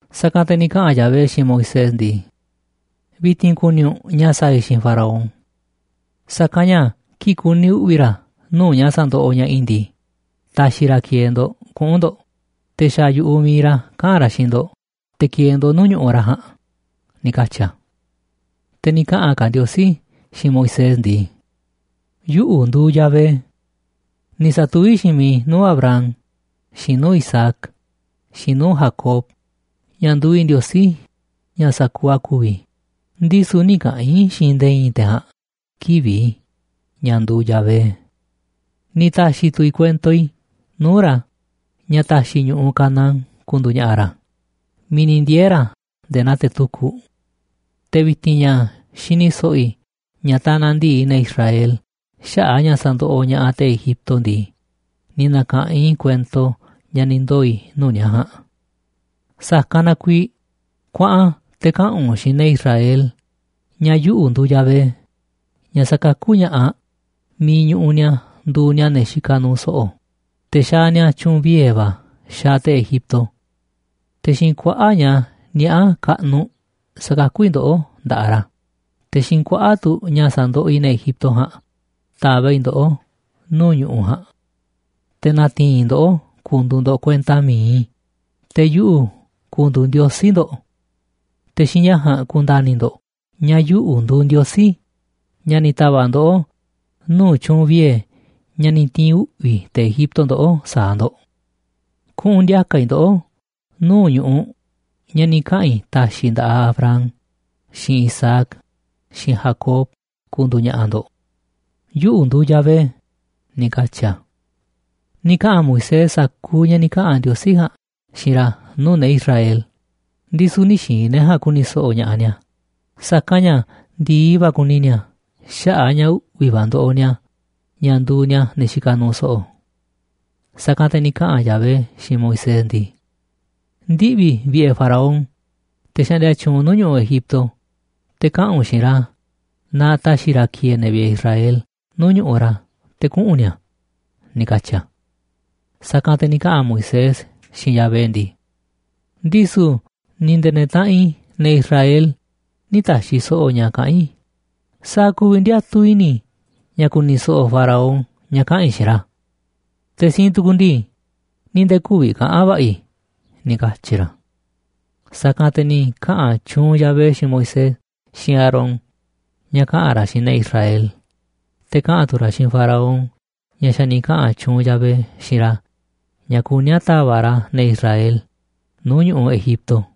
Sa̱kanꞌ te̱ ni̱ kaꞌa̱n Yahvé xiinꞌ Moisés ndii: ―Vi̱ti̱n ku̱ni̱ u̱nꞌ ña̱ sa̱a̱ i̱ xiinꞌ Faraón. Sa̱kanꞌ ña̱ kii̱ꞌ ku̱ni̱ uꞌvi̱ ra̱ nuu̱ꞌ ña̱ sa̱ndoꞌoꞌ ña̱ꞌaꞌ i̱ ndii, ta̱xi̱ ra̱ ki̱e̱e̱ ndo̱ꞌ kuꞌu̱n ndo̱ꞌ, te̱ xa̱ yu̱ꞌuꞌ mi̱iꞌ ra̱ kaꞌa̱n ra̱ xiinꞌ ndo̱ꞌ te̱ ki̱e̱e̱ ndo̱ꞌ nuu̱ꞌ ñu̱ꞌuꞌ ra̱ ja̱a̱nꞌ ―ni̱ katyi̱ a̱. Te̱ ni̱ kaꞌa̱n ka̱ Ndiosí xiinꞌ Moisés ndii: ―Yuꞌu̱ nduuꞌ Yahvé. Ni̱ sa̱tuví xiinꞌ miiꞌ i̱ nuu̱ꞌ Abraham, xiinꞌ nuu̱ꞌ Isaac, xiinꞌ nuu̱ꞌ Jacob, ña̱ nduuꞌ i̱ Ndiosí ña̱ sa̱kuuꞌ a̱ ku̱vi̱, ndisu̱ nï̱ kaꞌa̱n i̱ xiinꞌ nde̱e̱ i̱i̱n te̱ ja̱a̱nꞌ kivi̱ꞌ i̱ ña̱ nduuꞌ Yahvé. Ni̱ ta̱xi̱ tu̱ i̱ kuento i̱ nuu̱ꞌ ra̱ ña̱ ta̱xi̱ i̱ ñu̱ꞌuꞌ Canaán ku̱ndu̱u̱ ña̱ꞌa̱ ra̱ miiꞌ ni̱ ndiee̱ ra̱ nde̱e̱ naa te̱ tukuꞌ. Te̱ vi̱ti̱n ña̱ xini so̱ꞌo̱ i̱ ña̱ tanaꞌ ndi̱i ne̱ Israel xaꞌa̱ꞌ a̱ ña̱ sa̱ndoꞌoꞌ ña̱ꞌaꞌ te̱ Egipto ndii, ni̱ na̱ka̱ꞌanꞌ i̱ kuento ña̱ ni̱ ndoo̱ i̱ nuu̱ꞌ ni̱a̱ ja̱a̱nꞌ. Sa̱kanꞌ na kuiiꞌ kuaꞌan te̱ kaꞌa̱n u̱nꞌ xiinꞌ ne̱ Israel ña̱ yuꞌu̱ nduuꞌ Yahvé, ña̱ sa̱kakú ña̱ꞌaꞌ miiꞌ ñuꞌuꞌ ni̱a̱ nduuꞌ ni̱a̱ ne̱ xikaꞌ nuuꞌ so̱ꞌo̱, te̱ xaaꞌ ni̱a̱ tyu̱u̱n vie̱ va̱ xaaꞌ te̱ Egipto. Te̱ xiinꞌ kuaꞌa̱ꞌ ña̱ niaꞌá kaꞌnuꞌ sa̱kakú i̱ ndoꞌó nda̱ꞌaꞌ ra̱, te̱ xiinꞌ kuaꞌa̱ꞌ tu̱ ña̱ sa̱ndoꞌoꞌ i̱ ne̱ Egipto ja̱a̱nꞌ ta̱va̱ꞌ i̱ ndoꞌó nuu̱ꞌ ñu̱ꞌuꞌ ja̱a̱nꞌ. Te̱ na̱ti̱i̱n i̱ ndoꞌó ku̱ndu̱u̱ ndo̱ꞌ kuenta mi̱iꞌ i̱, te̱ yuꞌu̱ ku̱ndu̱u̱ Ndiosí ndo̱ꞌ. Te̱ xiinꞌ ña̱ ja̱a̱nꞌ ku̱nda̱ni̱ ndo̱ꞌ ña̱ yuꞌu̱ nduuꞌ Ndiosí ña̱ ni̱ ta̱va̱ꞌ ndoꞌó nuu̱ꞌ tyu̱u̱n vie̱ ña̱ ni̱ ti̱i̱n uꞌvi̱ te̱ Egipto ndoꞌó sa̱a̱ ndo̱ꞌ. Kuꞌu̱n ndi̱a̱ka̱ i̱ ndoꞌó nuu̱ꞌ ñu̱ꞌuꞌ ña̱ ni̱ kaꞌa̱n i̱ ta̱xi̱ i̱ nda̱ꞌaꞌ Abraham, xiinꞌ Isaac, xiinꞌ Jacob ku̱ndu̱u̱ ña̱ꞌa̱ ndo̱ꞌ. Yuꞌu̱ nduuꞌ Yahvé ―ni̱ katyi̱ a̱. Ni̱ kaꞌa̱n Moisés sa̱kuuꞌ ña̱ ni̱ kaꞌa̱n Ndiosí ja̱a̱nꞌ xiinꞌ ra̱ nuu̱ꞌ ne̱ Israel, ndisu̱ nï̱ xi̱i̱n ne̱ ja̱a̱nꞌ ku̱ni̱ so̱ꞌo̱ ña̱ꞌaꞌ ni̱a̱, sa̱kanꞌ ña̱ ndi̱i va̱ kuni ni̱a̱ xaꞌa̱ꞌ a̱ ña̱ uꞌvi̱ va̱ ndoꞌoꞌ ni̱a̱ ña̱ nduuꞌ ni̱a̱ ne̱ xikaꞌ nuuꞌ so̱ꞌo̱. Sa̱kanꞌ te̱ ni̱ kaꞌa̱n Yahvé xiinꞌ Moisés ndii: ―Ndiꞌvi̱ vi̱ꞌe̱ Faraón, te̱ xaꞌndia tyuunꞌ nuu̱ꞌ ñu̱ꞌuꞌ Egipto, te̱ kaꞌa̱n u̱nꞌ xiinꞌ ra̱ na ta̱xi̱ ra̱ ki̱e̱e̱ ne̱ vi̱ꞌe̱ Israel nuu̱ꞌ ñu̱ꞌuꞌ ra̱ te̱ kuꞌu̱n ni̱a̱ ―ni̱ katyi̱ a̱. Sa̱kanꞌ te̱ ni̱ kaꞌa̱n Moisés xiinꞌ Yahvé ndii: ―Ndisu̱ ni̱ nde̱e̱ ne̱ taꞌanꞌ i̱, ne̱ Israel, nï̱ ta̱xi̱ so̱ꞌo̱ ña̱ kaꞌán i̱, ¿sa̱a̱ ku̱vi̱ ndiatuꞌ i̱ni̱ i̱ ña̱ ku̱ni̱ so̱ꞌo̱ Faraón ña̱ kaꞌa̱n i̱ xiinꞌ ra̱? Te̱ siinꞌ tukuꞌ ndii, ni̱ nde̱e̱ kü̱vi̱ kaꞌa̱n va̱ꞌa̱ i̱ ―ni̱ katyi̱ ra̱. Sa̱kanꞌ te̱ ni̱ kaꞌa̱n tyuunꞌ Yahvé xiinꞌ Moisés xiinꞌ Aarón ña̱ kaꞌa̱n ra̱ xiinꞌ ne̱ Israel, te̱ kaꞌa̱n tu̱ ra̱ xiinꞌ Faraón ña̱ xa̱ ni̱ kaꞌa̱n tyuunꞌ Yahvé xiinꞌ ra̱ ña̱ kuní a̱ ta̱va̱ꞌ ra̱ ne̱ Israel nuu̱ꞌ ñu̱ꞌuꞌ Egipto.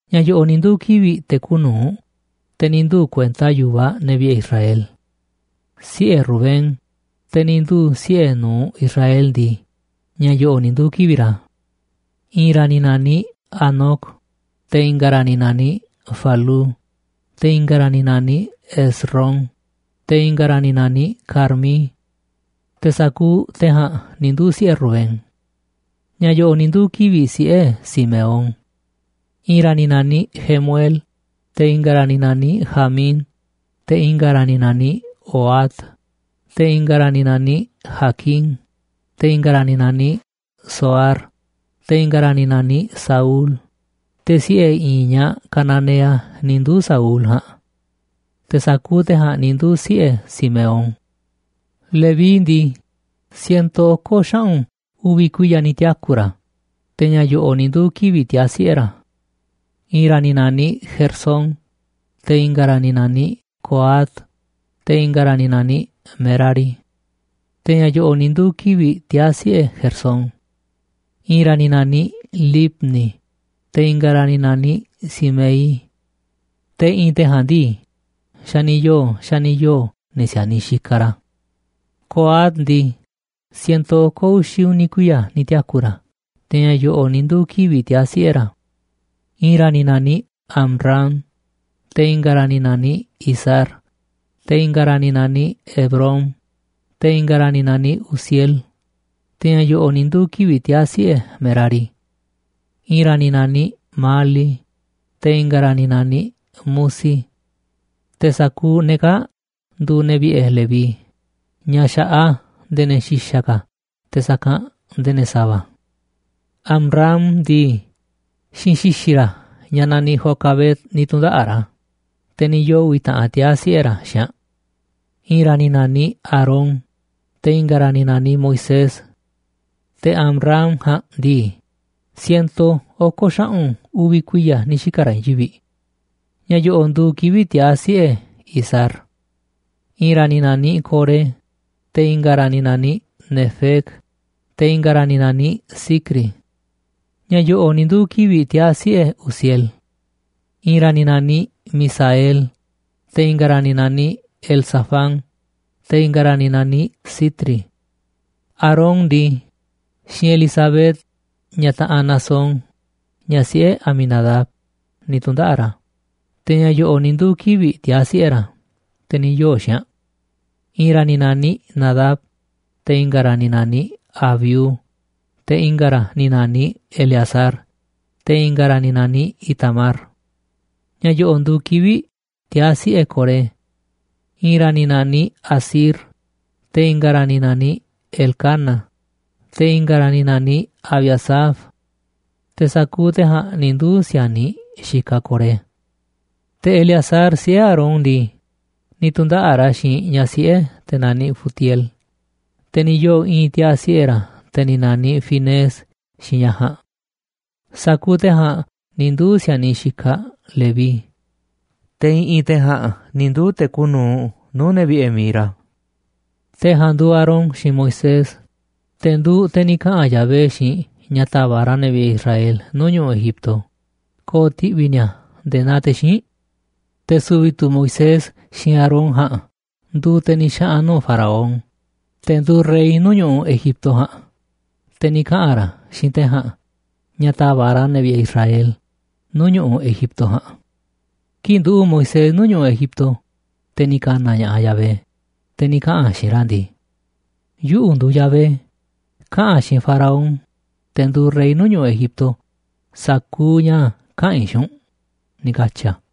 Ña̱ yo̱ꞌo̱ꞌ ni̱ nduu̱ kivi̱ꞌ te̱ kuuꞌ nu̱uꞌ, te̱ ni̱ nduu̱ kuenta yu̱vaꞌ ne̱ vi̱ꞌe̱ Israel. Siꞌe̱ Rubén, te̱ ni̱ nduu̱ siꞌe̱ nu̱uꞌ Israel ndii, ña̱ yo̱ꞌo̱ꞌ ni̱ nduu̱ kivi̱ꞌ ra̱: I̱i̱n ra̱ ni̱ na̱niꞌ Hanoc, te̱ i̱nga̱ ra̱ ni̱ na̱niꞌ Falú, te̱ i̱nga̱ ra̱ ni̱ na̱niꞌ Hezrón, te̱ i̱nga̱ ra̱ ni̱ na̱niꞌ Carmí. Te̱ sa̱kuuꞌ te̱ ja̱a̱nꞌ ni̱ nduu̱ siꞌe̱ Rubén. Ña̱ yo̱ꞌo̱ꞌ ni̱ nduu̱ kivi̱ꞌ siꞌe̱ Simeón: I̱i̱n ra̱ ni̱ na̱niꞌ Jemuel, te̱ i̱nga̱ ra̱ ni̱ na̱niꞌ Jamín, te̱ i̱nga̱ ra̱ ni̱ na̱niꞌ Ohad, te̱ i̱nga̱ ra̱ ni̱ na̱niꞌ Jaquín, te̱ i̱nga̱ ra̱ ni̱ na̱niꞌ Zohar, te̱ i̱nga̱ ra̱ ni̱ na̱niꞌ Saúl, te̱ siꞌe̱ i̱i̱n ñaꞌ cananea ni̱ nduu̱ Saúl ja̱a̱nꞌ. Te̱ sa̱kuuꞌ te̱ ja̱a̱nꞌ ni̱ nduu̱ siꞌe̱ Simeón. Leví ndii, siento oko̱ xaꞌu̱n uvi̱ kuiya̱ ni̱ tiaku̱ ra̱, te̱ ña̱ yo̱ꞌo̱ꞌ ni̱ nduu̱ kivi̱ꞌ tiaa̱ siꞌe̱ ra̱: I̱i̱n ra̱ ni̱ na̱niꞌ Gersón, te̱ i̱nga̱ ra̱ ni̱ na̱niꞌ Coat, te̱ i̱nga̱ ra̱ ni̱ na̱niꞌ Merari. Te̱ ña̱ yo̱ꞌo̱ꞌ ni̱ nduu̱ kivi̱ꞌ tiaa̱ siꞌe̱ Gersón: I̱i̱n ra̱ ni̱ na̱niꞌ Libni, te̱ i̱nga̱ ra̱ ni̱ na̱niꞌ Simei. Te̱ i̱ꞌi̱n te̱ ja̱a̱nꞌ ndii, xa̱ ni̱ yoo̱, xa̱ ni̱ yoo̱ ne̱ si̱a̱niꞌ xikaꞌ ra̱. Coat ndii, siento oko̱ uxi̱ uni̱ kuiya̱ ni̱ tiaku̱ ra̱, te̱ ña̱ yo̱ꞌo̱ꞌ ni̱ nduu̱ kivi̱ꞌ tiaa̱ siꞌe̱ ra̱: I̱i̱n ra̱ ni̱ na̱niꞌ Amram, te̱ i̱nga̱ ra̱ ni̱ na̱niꞌ Izhar, te̱ i̱nga̱ ra̱ ni̱ na̱niꞌ Hebrón, te̱ i̱nga̱ ra̱ ni̱ na̱niꞌ Uziel. Te̱ ña̱ yo̱ꞌo̱ꞌ ni̱ nduu̱ kivi̱ꞌ tiaa̱ siꞌe̱ Merari: I̱i̱n ra̱ ni̱ na̱niꞌ Mahli, te̱ i̱nga̱ ra̱ ni̱ na̱niꞌ Musi. Te̱ sa̱kuuꞌ ne̱ kaa̱ꞌ nduuꞌ ne̱ vi̱ꞌe̱ Leví ña̱ xa̱ꞌaꞌ a̱ nde̱e̱ ne̱ xi̱xa̱ ka̱ te̱ sa̱kanꞌ nde̱e̱ ne̱ sa̱va̱. Amram ndii, xiinꞌ xi̱xi̱ ra̱ ñaꞌ naniꞌ Jocabed ni̱ tu̱ndaꞌa̱ꞌ ra̱, te̱ ni̱ yoo̱ uvi̱ taꞌan tiaa̱ siꞌe̱ ra̱ xiinꞌ aꞌ: I̱i̱n ra̱ ni̱ na̱niꞌ Aarón, te̱ i̱nga̱ ra̱ ni̱ na̱niꞌ Moisés. Te̱ Amram ja̱a̱nꞌ ndii, siento oko̱ xaꞌu̱n uvi̱ kuiya̱ ni̱ xika̱ ra̱ i̱i̱n yivi̱ꞌ. Ña̱ yo̱ꞌo̱ꞌ nduuꞌ kivi̱ꞌ tiaa̱ siꞌe̱ Izhar: I̱i̱n ra̱ ni̱ na̱niꞌ Coré, te̱ i̱nga̱ ra̱ ni̱ na̱niꞌ Nefeg, te̱ i̱nga̱ ra̱ ni̱ na̱niꞌ Zicri. Ña̱ yo̱ꞌo̱ꞌ ni̱ nduu̱ kivi̱ꞌ tiaa̱ siꞌe̱ Uziel: I̱i̱n ra̱ ni̱ na̱niꞌ Misael, te̱ i̱nga̱ ra̱ ni̱ naniꞌ Elzafán, te̱ i̱nga̱ ra̱ ni̱ naniꞌ Sitri. Aarón ndii, xiinꞌ Elisabet, ñaꞌ taꞌanꞌ Naasón, ñaꞌ siꞌe̱ Aminadab, ni̱ tu̱ndaꞌa̱ꞌ ra̱. Te̱ ña̱ yo̱ꞌo̱ꞌ ni̱ nduu̱ kivi̱ꞌ tiaa̱ siꞌe̱ ra̱, te̱ ni̱ yoo̱ xiinꞌ aꞌ: I̱i̱n ra̱ ni̱ na̱niꞌ Nadab, te̱ i̱nga̱ ra̱ ni̱ na̱niꞌ Abiú, te̱ i̱nga̱ ra̱ ni̱ na̱niꞌ Eleazar, te̱ i̱nga̱ ra̱ ni̱ na̱niꞌ Itamar. Ña̱ yo̱ꞌo̱ꞌ nduuꞌ kivi̱ꞌ tiaa̱ siꞌe̱ Coré: I̱i̱n ra̱ ni̱ na̱niꞌ Asir, te̱ i̱nga̱ ra̱ ni̱ na̱niꞌ Elcana, te̱ i̱nga̱ ra̱ ni̱ na̱niꞌ Abiasaf. Te̱ sa̱kuuꞌ te̱ ja̱a̱nꞌ ni̱ nduu̱ si̱a̱niꞌ xikaꞌ Coré. Te̱ Eleazar, siꞌe̱ Aarón ndii, ni̱ tu̱ndaꞌa̱ꞌ ra̱ xiinꞌ ñaꞌ siꞌe̱ te̱ naniꞌ Futiel, te̱ ni̱ yoo̱ i̱i̱n tiaa̱ siꞌe̱ ra̱, te̱ ni̱ na̱niꞌ Finees xiinꞌ ñaꞌ ja̱a̱nꞌ. Sa̱kuuꞌ te̱ ja̱a̱nꞌ ni̱ nduu̱ si̱a̱niꞌ xikaꞌ Leví, te̱ i̱ꞌi̱n te̱ ja̱a̱nꞌ ni̱ nduu̱ te̱ kuuꞌ nu̱uꞌ nuu̱ꞌ ne̱ vi̱ꞌe̱ mi̱iꞌ ra̱. Te̱ ja̱a̱nꞌ nduuꞌ Aarón xiinꞌ Moisés, te̱ nduuꞌ te̱ ni̱ kaꞌa̱n Yahvé xiinꞌ ña̱ ta̱va̱ꞌ ra̱ ne̱ vi̱ꞌe̱ Israel nuu̱ꞌ ñu̱ꞌuꞌ Egipto ko̱o̱ ti̱ꞌvi̱ ni̱a̱ nde̱e̱ naa te̱ xíinꞌ. Te̱ su̱vi̱ tu̱ Moisés xiinꞌ Aarón ja̱a̱nꞌ nduuꞌ te̱ ni̱ xaꞌa̱n nuu̱ꞌ Faraón, te̱ nduuꞌ rey nuu̱ꞌ ñu̱ꞌuꞌ Egipto ja̱a̱nꞌ, te̱ ni̱ kaꞌa̱n ra̱ xiinꞌ te̱ ja̱a̱nꞌ ña̱ ta̱va̱ꞌ ra̱ ne̱ vi̱ꞌe̱ Israel nuu̱ꞌ ñu̱ꞌuꞌ Egipto ja̱a̱nꞌ. Kii̱ꞌ nduꞌu̱ꞌ Moisés nuu̱ꞌ ñu̱ꞌuꞌ Egipto, te̱ ni̱ ka̱na̱ ña̱ꞌaꞌ Yahvé, te̱ ni̱ kaꞌa̱n a̱ xiinꞌ ra̱ ndii: ―Yuꞌu̱ nduuꞌ Yahvé. Kaꞌa̱n xiinꞌ Faraón, te̱ nduuꞌ rey nuu̱ꞌ ñu̱ꞌuꞌ Egipto, sa̱kuuꞌ ña̱ kaꞌa̱n i̱ xiinꞌ u̱nꞌ ―ni̱ katyi̱ a̱.